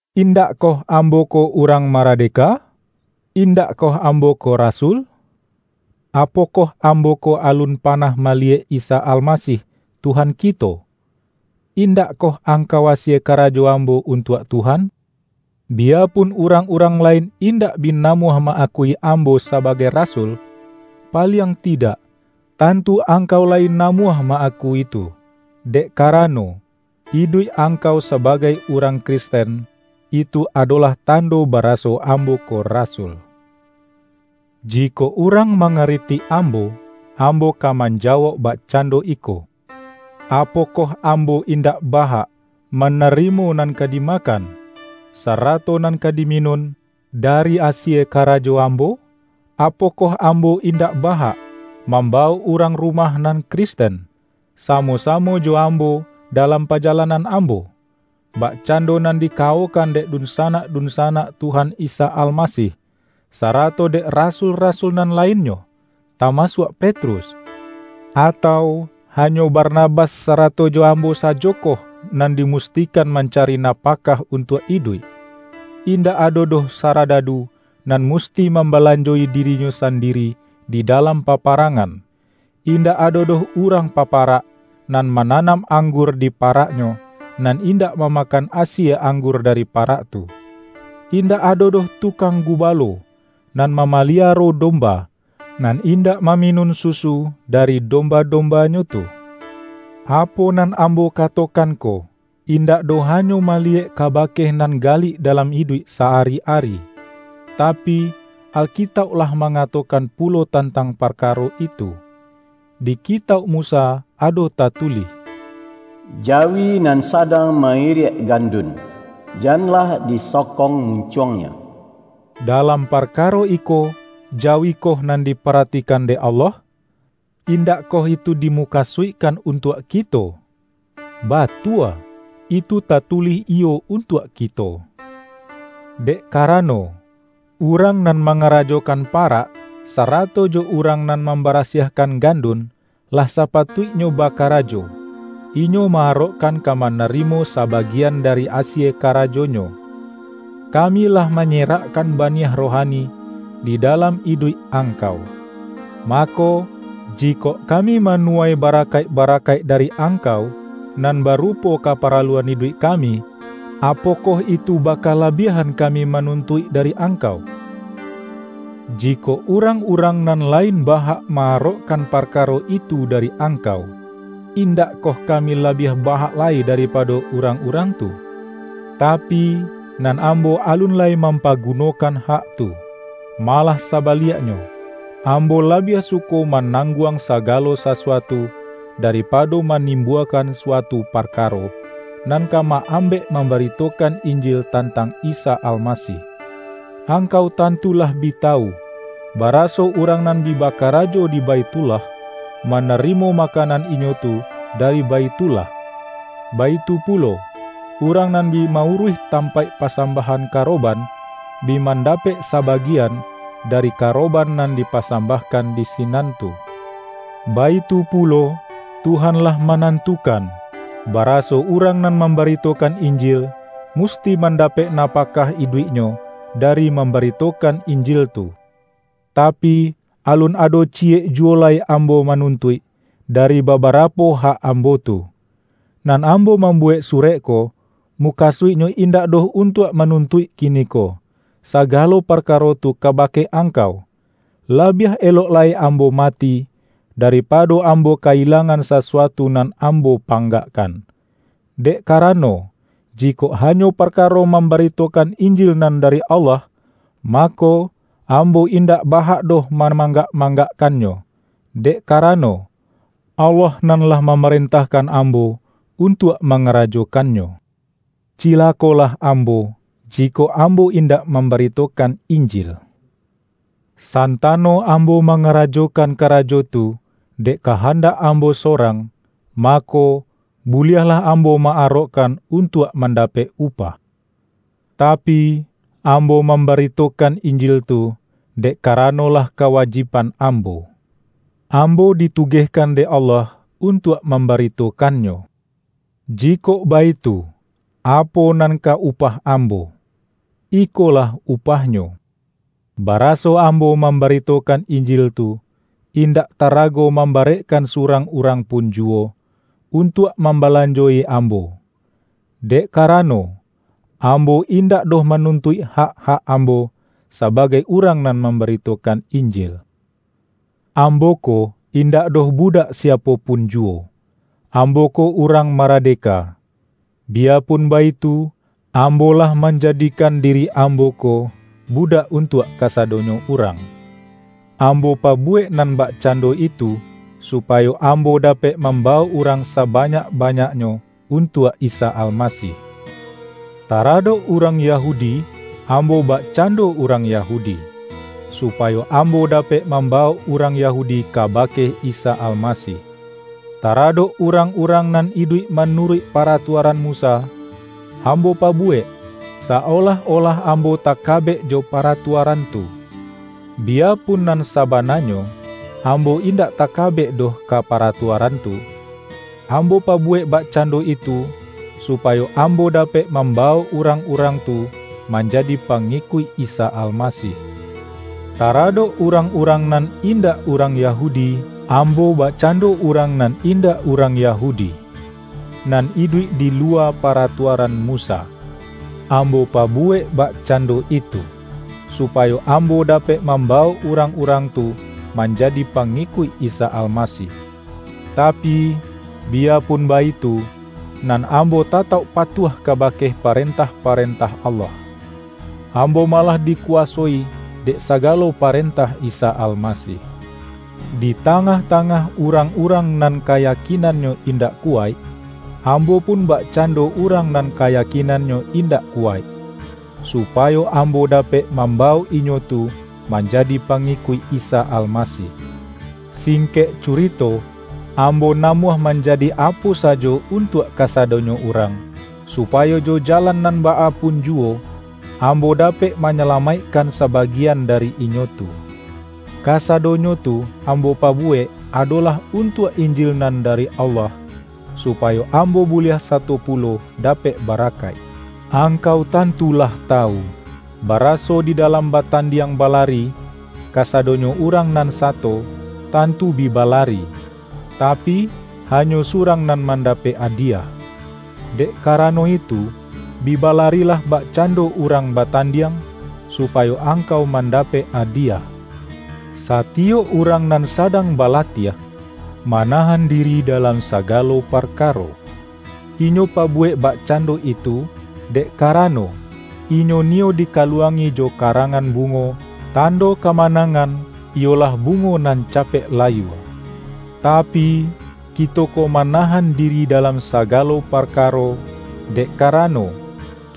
Indakkoh ambo ko urang marade-ka? Indakkoh ambo ko rasul? Apo-koh ambo ko alun panah maliyek Isa Almasih, Tuhan kito? Indakkoh ang-kau asie karajo ambo untuak Tuhan? Biyapun urang-urang lain indak bi namuah ma-akui ambo sabagai rasul, paliang tidak, tantu angkau layi na-muah ma-akui tu! Dek karano, iduik angkau sabagai urang Kristen, itu ado-lah tando baraso ambo ko rasul. Jikok urang mangaritik ambo, am-bo ka manjawauk bakcando iko: Apo-koh ambo indak bahak, manarimo nan ka dimakan, sarato nan ka diminun, dari asie karajo ambo? Apokoh am-bo indak bahak, mambawok urang ru-mah nan Kristen, samo-samo jo am-bo dalam pajalanan ambo, bakcando nan dikawokan dek dunsanak-dunsa-nak Tuhan Isa Almasih, sarato dek ra-sul-rasul nan lainnyo, tamasuak Pet-rus? Atau, hanyo Barnabas, sarato jo ambo sajokoh, nan dimustikan manca-ri napakah untuak iduik? Indak ado doh saradadu, nan musti mambalanjo-i dirinyo sandiri di dalam paparangan! Indak ado doh urang paparak, nan ma-nanam anggur di paraknyo, nan indak mamakan asie anggur dari parak tu! Indak ado doh tukang gubalo, nan ma-maliaro domba, nan indak maminun susu dari domba-dombanyo tu! Apo nan ambo katokan ko, indak doh hanyo maliyek kabake nan galik dalam iduik sa-ari-ari, tapi, Alkitauk lah mangatokan pulo tantang parkaro itu. Di Kitauk Musa ado tatulih, ”Jawi nan sadang ma-iriak gandun, janlah di-sokong muncuangnyo.” Dalam parkaro iko, jawikoh nan diparatikan dek Allah? Indakkoh itu dimukasuikkan untuak kito? Batua, itu tatulih iyo untuak kito. Dek karano, urang nan mangarajokan parak, sarato jo urang nan mambara-siahkan gandun, lah sapatuiknyo baka-rajo, inyo ma-arokkan ka manarimo sa-bagian dari asie karajonyo. Kami lah manyerakkan baniah rohani, di dalam iduik angkau. Mako, jikok kami manu-wai barakaik-barakaik dari angkau, nan barupo kaparaluan iduik kami, apokoh itu bakalabiahan kami manuntuik dari angkau? Jikok urang-urang nan la-in ba-hak ma-arokkan parkaro itu dari angkau, indakkoh kami labiah ba-hak lai daripado urang-urang tu? Tapi, nan ambo alun lai mampaguno-kan hak tu. Malah sabaliaknyo, ambo labiah suko manangguang sagalo sa-suatu, daripado manimbuakan suatu parkaro, nan ka ma-ambek mambarito-kan Injil tantang Isa Almasih. Ang-kau tantu lah bi tawu, baraso urang nan bi bakarajo di Baithullah, manari-mo makanan inyo tu dari Baithullah. Baitu pulo, urang nan bi ma-uruih tam-paik pasambahan karoban, bi manda-pek sabagian, dari karoban nan dipa-sambahkan di sinan tu. Baitu pulo, Tuhan lah manantukan, baraso urang nan mambaritokan Injil, musti man-dapek napakah iduiknyo dari mam-baritokan Injil tu. Tapi, alun ado ciyek juwo lai am-bo manuntuik, dari babarapo hak am-bo tu. Nan ambo mambuwek surek ko, mukasuiknyo indak doh untuak manuntuik kiniko, sagalo parkaro tu kabake angkau! Labiah elok lai ambo mati, daripado ambo ka-ilangan sasu-atu nan ambo panggakkan. Dek ka-rano, jikok hanyo parkaro mambarito-kan Injil nan dari Allah, mako, ambo indak ba-hak doh mamanggak-mang-gakkannyo, dek karano, Allah nan lah mamarentahkan ambo untuak manga-rajokannyo. Cilakolah ambo, jikok am-bo indak mambaritokan Injil! San-tano ambo mangarajokan karajo tu, dek kahandak ambo sorang, mako, buliahlah ambo ma-arokkan untuak mandapek upah. Tapi, ambo mambari-tokan Injil tu, dek karano lah kawajib-an ambo. Ambo ditugehkan dek Allah untuak mambaritokannyo. Jikok baitu, apo nan ka upah ambo? Ikolah upahnyo: baraso ambo mambarito-kan Injil tu, indak tarago mambarek-kan surang urang pun juwo, untuak mambalanjo-i ambo, dek karano, am-bo indak doh manuntuik hak-hak am-bo, sabagai urang nan mambaritokan Injil. Ambo ko, indak doh budak siapo punjuwo; ambo ko urang maradeka. Biyapun baitu, ambo lah manjadikan diri ambo ko budak untuak kasadonyo urang. Ambo pabuwek nan bakcando itu, supayo ambo dapek mambawok urang sabanyak-banyaknyo untuak Isa Almasih. Taradok urang Yahu-di, ambo bakcando urang Yahudi, su-payo ambo dapek mambawok urang Yahudi kabake Isa Almasih. Taradok urang-urang nan iduik manuruik para-tuaran Musa, ambo pabuwek, sa-olah-olah ambo takabek jo paratuaran tu, biyapun nan sabananyo, ambo indak takabek doh ka paratuaran tu. Ambo pabuwek bakcando itu, supayo ambo dapek mambawok urang-urang tu man-jadi pangikuik Isa Almasih. Taradok urang-urang nan indak urang Yahu-di, ambo bakcando urang nan indak urang Yahudi, nan iduik di luwa pa-ratuaran Musa. Ambo pabuwek bak-cando itu, supayo ambo dapek mamba-wok urang-urang tu manjadi pangikuik Isa Almasih. Tapi, biyapun baitu, nan ambo tatauk patuah kabake parentah-parentah Allah; ambo malah dikuwa-soi dek sagalo parentah Isa Almasih. Di tangah-tangah urang-urang nan kayakinannyo indak kuwaik, ambo pun bakcando urang nan kayakinan-nyo indak kuwaik, supayo ambo da-pek mambawok inyo tu manjadi pa-ngikuik Isa Almasih. Singkek curito, ambo namuah manjadi apo sajo untuak kasadonyo urang, supayo jo jalan nan baa pun juwo, ambo dapek manyala-maikkan sabagian dari inyo tu. Kasadonyo tu ambo pabuwek, ado-lah untuak Injil nan dari Allah, supayo ambo buliah sato pulo dapek barakaik. Angkau tantu lah tawu, baraso di dalam batandiang balari, kasadonyo urang nan sato, tantu bi balari, tapi, hanyo surang nan mandapek adiyah. Dek karano itu, bi balarilah bakcan-do urang batandiang, supayo angkau mandapek adiyah. Satiyok urang nan sadang balatiah, manahan diri dalam sagalo parkaro. Inyo pabuwek bakcando itu, dek karano, inyo niyo dikaluangi jo karangan bungo, tando kamanangan, iyolah bungo nan capek layua. Tapi, kito ko manahan diri da-lam sagalo parkaro, dek karano,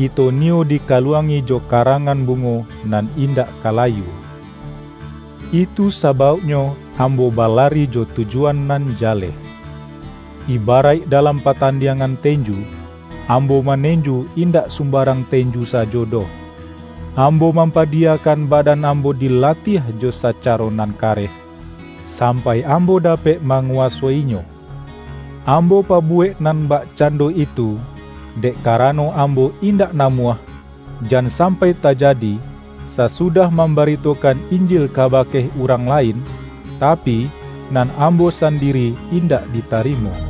kito niyo dikaluangi jo karangan bungo nan indak ka layua. Itu sabauknyo ambo balari jo tujuan nan jaleh. Iba-raik dalam patandiangan tenju, ambo manenju indak sumbarang tenju sajo doh. Ambo mampadiyakan badan ambo dilatiah jo sacaro nan kareh, sampai ambo dapek manguwaso-inyo. Ambo pabuwek nan bakcando itu, dek karano ambo indak namuah, jan sam-pai tajadi, sasudah mambaritokan In-jil kabake urang lain, tapi, nan ambo sandiri indak ditarimo.